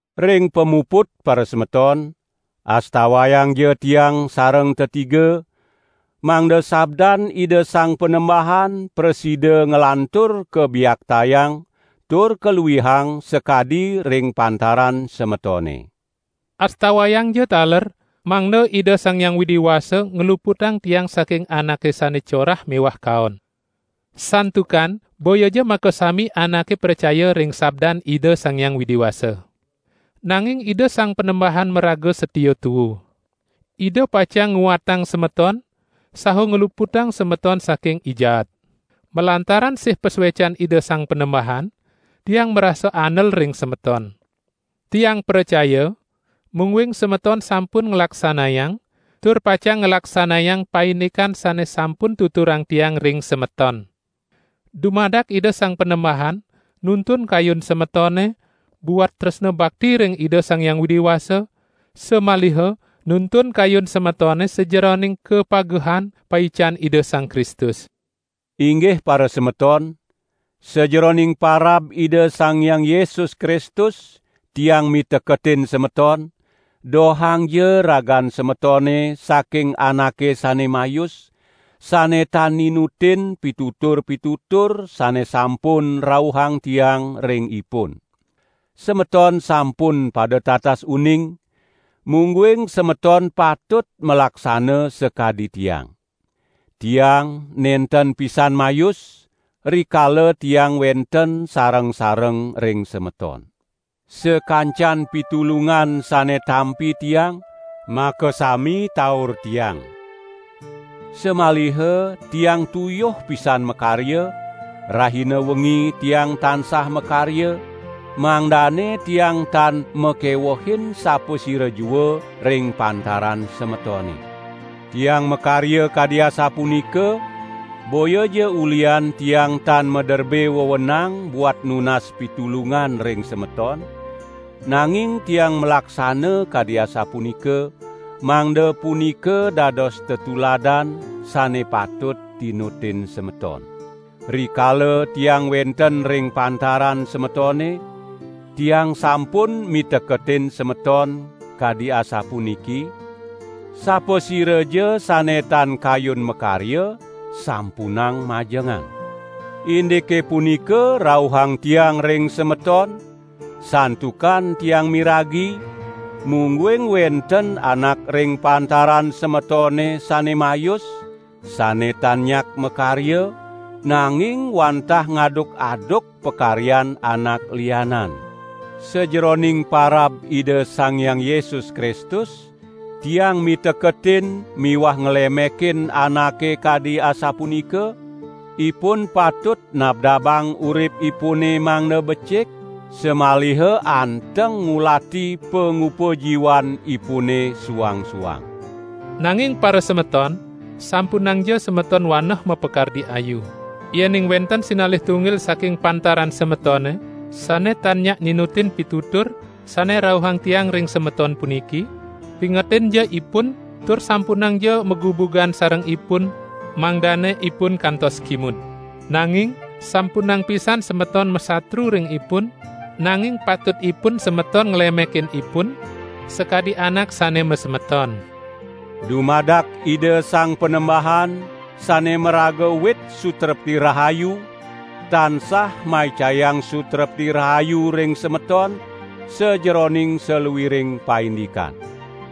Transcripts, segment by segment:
Ring pamuput parasemeton, astawayangja tiang sareng tetiga, mangda sabdan Ida Sang Panembahan prasida nglantur kabiaktayang tur kaluihang sakadi ring pantaran semetone. Astawayangja taler mangda Ida Sang Hyang Widi Wasa ngluputang tiang saking anake sane corah miwah kaon. Santukan boyaja makasami anake pracaya ring sabdan Ida Sang Hyang Widi Wasa. Nanging Ida Sang Panembahan maraga satia tuu. Ida pacang nguatang semeton saha ngluputang semeton saking I Jaat. Malantaran sih pasuecan Ida Sang Panembahan, tiang marasa andel ring semeton. Tiang pracaya mungguing semeton sampun nglaksanayang tur pacang nglaksanayang paindikan sane sampun tuturang tiang ring semeton. Dumadak Ida Sang Panembahan nuntun kayun semetone buat tresna bakti ring Ida Sang Hyang Widi Wasa, samaliha nuntun kayun semetone sajeroning kapagehan, paican Ida Sang Kristus. Inggih parasemeton, sajeroning parab Ida Sang Hyang Yesus Kristus tiang miteketin semeton; dohangja ragan semetone saking anake sane mayus, sane tan ninutin pitutur-pitutur sane sampun rauhang tiang ring ipun. Semeton sampun pada tatas uning, mungguing semeton patut malaksana sakadi tiang. Tiang nenten pisan mayus, rikala tiang wenten sareng-sareng ring semeton. Sakancan pitulungan sane tampi tiang, makasami taur tiang. Samaliha tiang tuyuh pisan makarya; rahina wengi tiang tansah makarya, mangdane tiang tan makewehin sapasira jua ring pantaran semetone. Tiang makarya kadi asapunika, boyaja ulihan tiang tan maderbe wewenang buat nunas pitulungan ring semeton, nanging tiang malaksana kadi asapunika, mangda punika dados tetuladan, sane patut tinutin semeton. Rikala tiang wenten ring pantaran semetone, tiang sampun miteketin semeton kadi asapuniki: "Sapasiraja sane tan kayun makarya, sampunang majengan!" Indike punika rauhang tiang ring semeton, santukan tiang miragi, mungguing wenten anak ring pantaran semetone sane mayus, sane tan nyak makarya, nanging wantah ngaduk-aduk pakaryan anak lianan. Sajeroning parab Ida Sang Hyang Yesus Kristus, tiang miteketin miwah nglemekin anake kadi asapunika; ipun patut nabdabang uripipune mangda becik samaliha anteng ngulati pangupajiwanipune suang-suang. Nanging parasemeton, sampunangja semeton waneh mapakardi ayu. Yening wenten sinalih tunggil saking pantaran semetone sane tan nyak ninutin pitutur sane rauhang tiang ring semeton puniki, pingetinja ipun tur sampunangja magubugan sareng ipun, mangdane ipun kantos kimud. Nanging sampunang pisan semeton masatru ring ipun, nanging patutipun semeton nglemekin ipun, sakadi anak sane masemeton. Dumadak Ida Sang Panembahan sane maraga wit sutrepti rahayu, tansah maicayang sutrepti rahayu ring semeton sajeroning saluiring paindikan.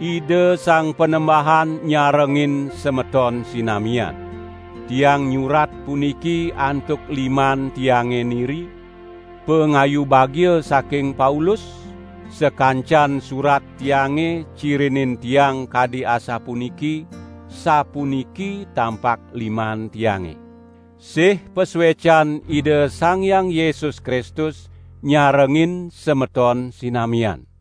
Ida Sang Panembahan nyarengin semeton sinamian. Tiang nyurat puniki antuk liman tiange niri: Pangayu bagia saking Paulus. Sakancan surat tiange cirinin tiang kadi asapuniki, sapuniki tampak liman tiange! Sih pasuecan Ida Sang Hyang Yesus Kristus nyarengin semeton sinamian.